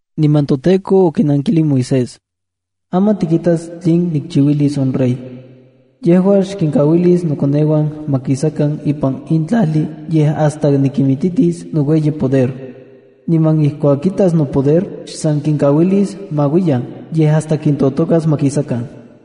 Niman toTEKO okinankilij Moisés: —Aman tikitas tlinon nikchiuilis on rey. Yejua xkinkauilis nokoneuan ma kisakan ipan in tlajli yej hasta nikititis noueyipoder. Niman ijkuak kitas nopoder, xsan kinkauilis ma uiyan, yej hasta kintotokas ma kisakan.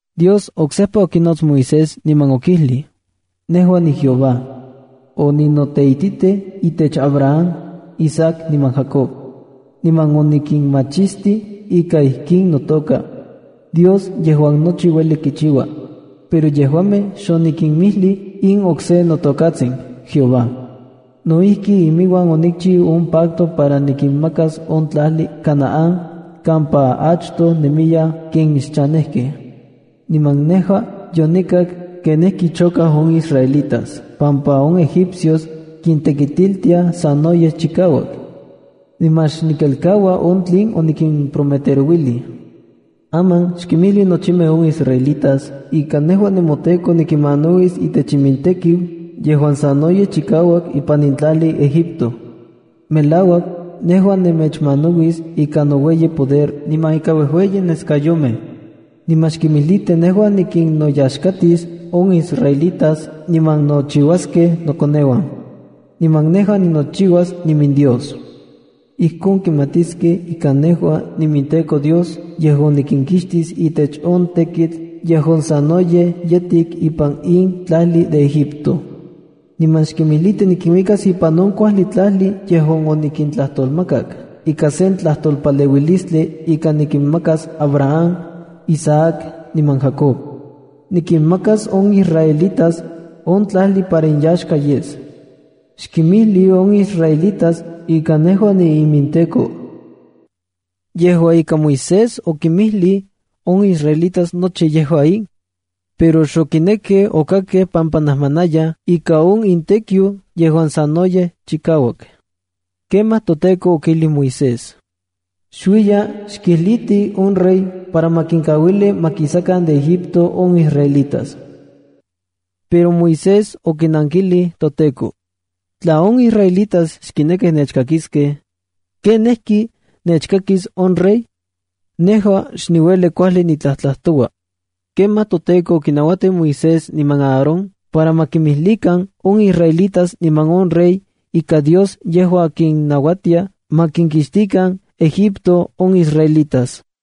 Dios oksejpa okinots Moisés niman okijlij: —Nejua niJEHOVÁ. Oninoteititij itech Abraham, Isaac niman Jacob, niman onikinmachistij ika ijkin notoka “Dios yejuan nochi ueli kichiua”. Pero yejuamej xonikinmijlij in okse notokatsin “JEHOVÁ”. No ijki, iminuan onikchiu on pacto para nikinmakas on tlajli Canaán kampa achtoj nemiyaj ken xchanejkej. Niman nejua yonikak kenijki chokaj on israelitas pampa on egipcios kintekitiltiaj sanoyej chikauak, niman xnikelkaua on tlen onikimprometerouilij. Aman xkinmijli nochimej on israelitas ika nejua nemoTEKO nikinmanauis itech imintekiu yejuan sanoyej chikauak ipan in tlajli Egipto. Melauak, nejua nemechmanauis ika noueyipoder niman ika uejueyi neskayomej. Niman xkimijliti nejua nikinnoyaxkatis on israelitas niman nochiuaskej nokoneuan. Niman nejua ninochiuas iminDios. Ijkon kimatiskej ika nejua iminTEKO Dios yejuan nikinkixtis itech on tekitl yejuan sanoyej yetik ipan in tlajli Egipto. Niman xkimijliti nikinuikas ipan on kuajli tlajli yejuan onikintlajtolmakak ika sen tlajtolpaleuilistli ika nikinmakas Abraham, Isaac niman Jacob. Nikinmakas on israelitas on tlajli para inyaxka yes. Xkinmijli on israelitas ika nejua niiminTEKO. Yejua ika, Moisés okinmijlij on israelitas nochi yejua in, pero xokinekej okakkej pampa najmanayaj ika on imintekiu yejuan sanoyej chikauak. Kemaj toTEKO okijlij Moisés: —Xuiya xkijliti on rey para ma kinkauili ma kisakan de Egipto on israelitas. Pero Moisés okinankilij toTEKO: —Tla on israelitas xkinekij nechkakiskej, ¿kenijki nechkakis on rey? Nejua xniueli kuajli nitlajtlajtoua. Kemaj toTEKO okinauatij Moisés niman Aarón para ma kinmijlikan on israelitas niman on rey, ika Dios yejua kinnauatia ma kinkixtikan Egipto on israelitas.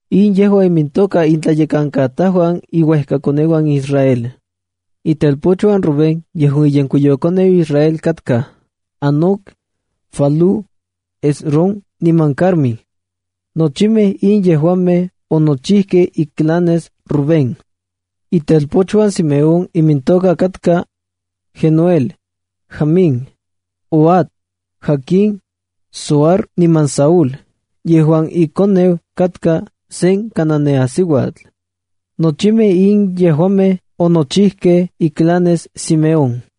In yejua imintoka intlayekankatajuan iuejkakoneuan Israel. Itelpochuan Rubén, yejuan iyenkuiyokoneu Israel, katka: Hanoc, Falú, Hezrón niman Carmí. Nochimej in yejuamej onochijkej iclanes Rubén. Itelpochuan Simeón imintoka katka: Jenuel, Jamín, Ohad, Jaquín, Zohar niman Saúl yejuan ikoneu katka sen Cananeasiuatl. Nochimej in yejuamej onochijkej iclanes Simeón.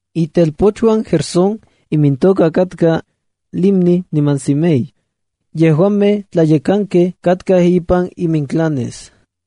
Itelpochuan Gersón imintoka katka: Libni niman Simei. Yejuamej tlayekankej katkaj ipan iminclanes.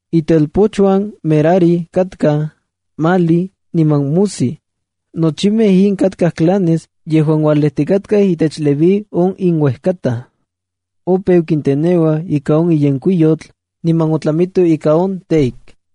Itelpochuan Merari katkaj: Mahli niman Musi. Nochimej in katkaj clanes yejuan ualejtikatkaj itech Leví on inuejkataj. Opeu kinteneuaj ika on yenkuiyotl, niman otlamitoj ika on teik.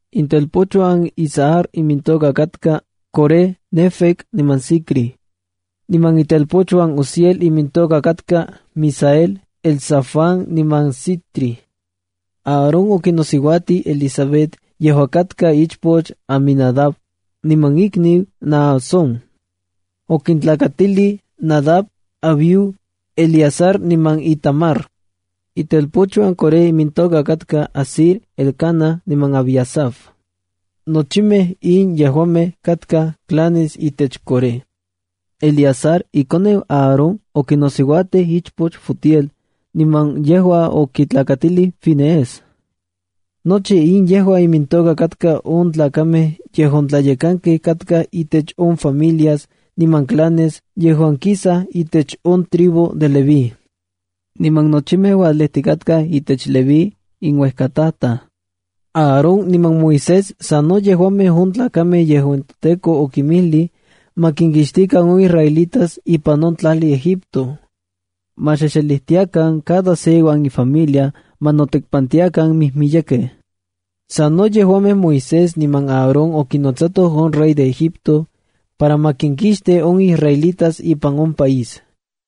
Itelpochuan Izhar imintoka katka: Coré, Nefeg niman Zicri. Niman itelpochuan Uziel imintoka katka: Misael, Elzafán niman Sitri. Aarón okinosiuatij Elisabet yejuan katka ichpoch Aminadab niman ikniu Naasón. Okintlakatilij Nadab, Abiú, Eleazar niman Itamar. Itelpochuan Coré imintoka katka: Asir, Elcana niman Abiasaf. Nochimej in yejuamej katkaj clanes itech Coré. Eleazar, ikoneu Aarón, okinosiuatij semej de ichpochuan Futiel niman yejua okitlakatilij Finees. Nochi in yejua imintoka katka on tlakamej yejuan tlayekankej katkaj intech on familias niman clanes yejuan kisaj itech on tribu de Leví. Niman nochimej ualejtikatkaj itech Leví, inuejkatataj. Aarón niman Moisés sa no yejuamej on tlakamej yejuan toTEKO okinmijlij ma kinkixtikan on israelitas ipan on tlajli Egipto. Ma xexelijtiakan cada se iuan ifamilia ma notekpantiakan mijmiyekej. Sano yejuamej Moisés niman Aarón okinotsatoj on rey de Egipto para ma kinkixti on israelitas ipan on país.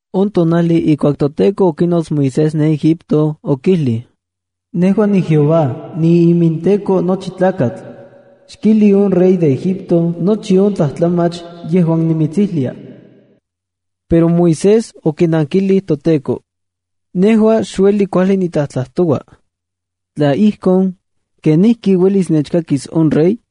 On tonajli ijkuak toTEKO okinots Moisés ne Egipto, okijlij: —Nejua niJEHOVA. NiiminTEKO nochi tlakatl. Xkijli on rey de Egipto nochi on tlajtlamach yejuan nimitsijlia. Pero Moisés okinankilij toTEKO: —Nejua xniueli kuajli nitlajtlajtoua. Tla ijkon, ¿kenijki uelis nechkakis on rey?